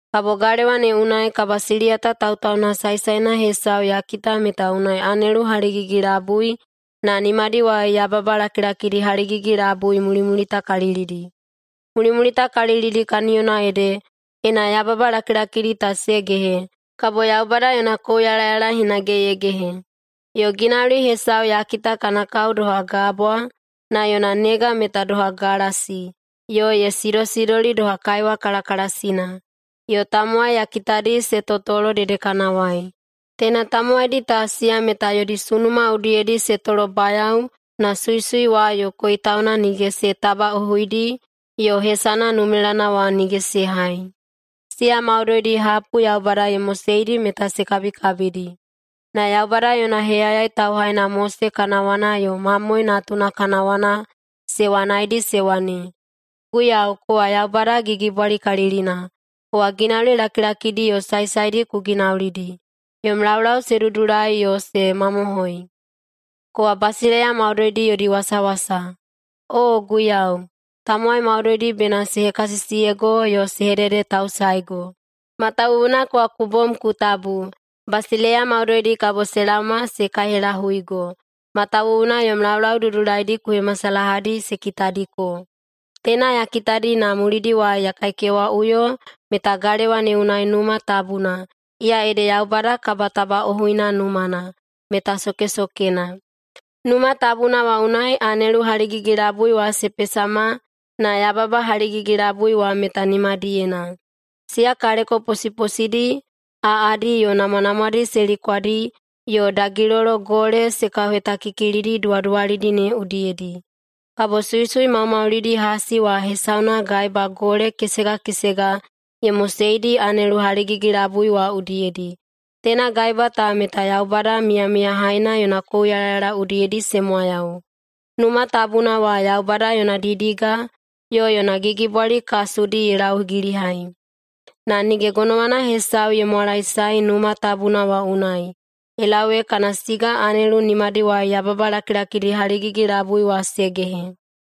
Kabo galewa ne unai kabasiliyata tautauna saesaena hesau ya kita meta unai anelu haligigi-labui na nimadiwai yababa lakilakidi haligigi-labui mulimulitakalilidi. Mulimulitakalilidi kaniyona ede ena yababa lakilakidi ta se gehe, kabo Yaubada yona kouyalayala hinage ye gehe. Yo ginauli hesau ya kita kana kao doha gabwa na yona nega meta doha galasi yo ye sidosidoli doha kaiwa kalakalasina. Yo tamowai ya kitadi se totolo dedekanawai. Teina tamowaidi ta, siya meta yodi sunuma udiyedi se tolobayao na suisui wa yo koitauna nige se tabaꞌohuidi yo hesana numelana wa nige se hai. Siya maudoidi hapu Yaubada ye moseidi meta se kabikabidi. Na Yaubada yona heyayai tauhaina Mose kana wana yo Mamoe Natuna kana wana se wanaidi se wane, “Guiyau, kowa Yaubada Gigibwalikalilina! Kowa ginauli lakilakidi yo saesaedi ku ginaulidi. Yom laulau se dudulai yo se mamohoi. Kowa basileiya maudoidi yodi wasawasa. Oo Guiyau, tamowai maudoidi bena se hekasisiyego yo se hededetausaego, matawuwuna kowa ku bom ku tabu. Basileiya maudoidi kabo se laoma se kaihelahuigo, matawuwuna yom laulau dudulaidi ku hemasalahadi se kitadiko.” Teina ya kitadi na mulidiwai ya kaikewaꞌuyo meta galewa ne unai Numa Tabuna, iya ede Yaubada kabatabaꞌohuina numana, meta sokesokena. Numa Tabuna wa unai anelu haligigi-labui wa se pesama na yababa haligigi-labui wa meta nimadiyena. Siya kaleko posiposidi, aꞌadi, yo namwanamwadi se likwadi yo dagilolo gole se kauhetakikilidi duwaduwalidi ne udiyedi. Kabo suisui maumaulidi hasi wa hesauna gaeba gole kesega kesega ye moseidi anelu haligigi-labui wa udiyedi. Teina gaeba ta meta Yaubada Miyamiyahaina yona kouyalayala udiyedi se mwayau. Numa Tabuna wa Yaubada yona didiga yo yona gigibwali kasudi ye laugilihai. Na nige gonowana hesau ye mwalaesae Numa Tabuna wa unai ye lau ee kana siga anelu nimadiwai yababa lakilakidi haligigi-labui wa se gehe.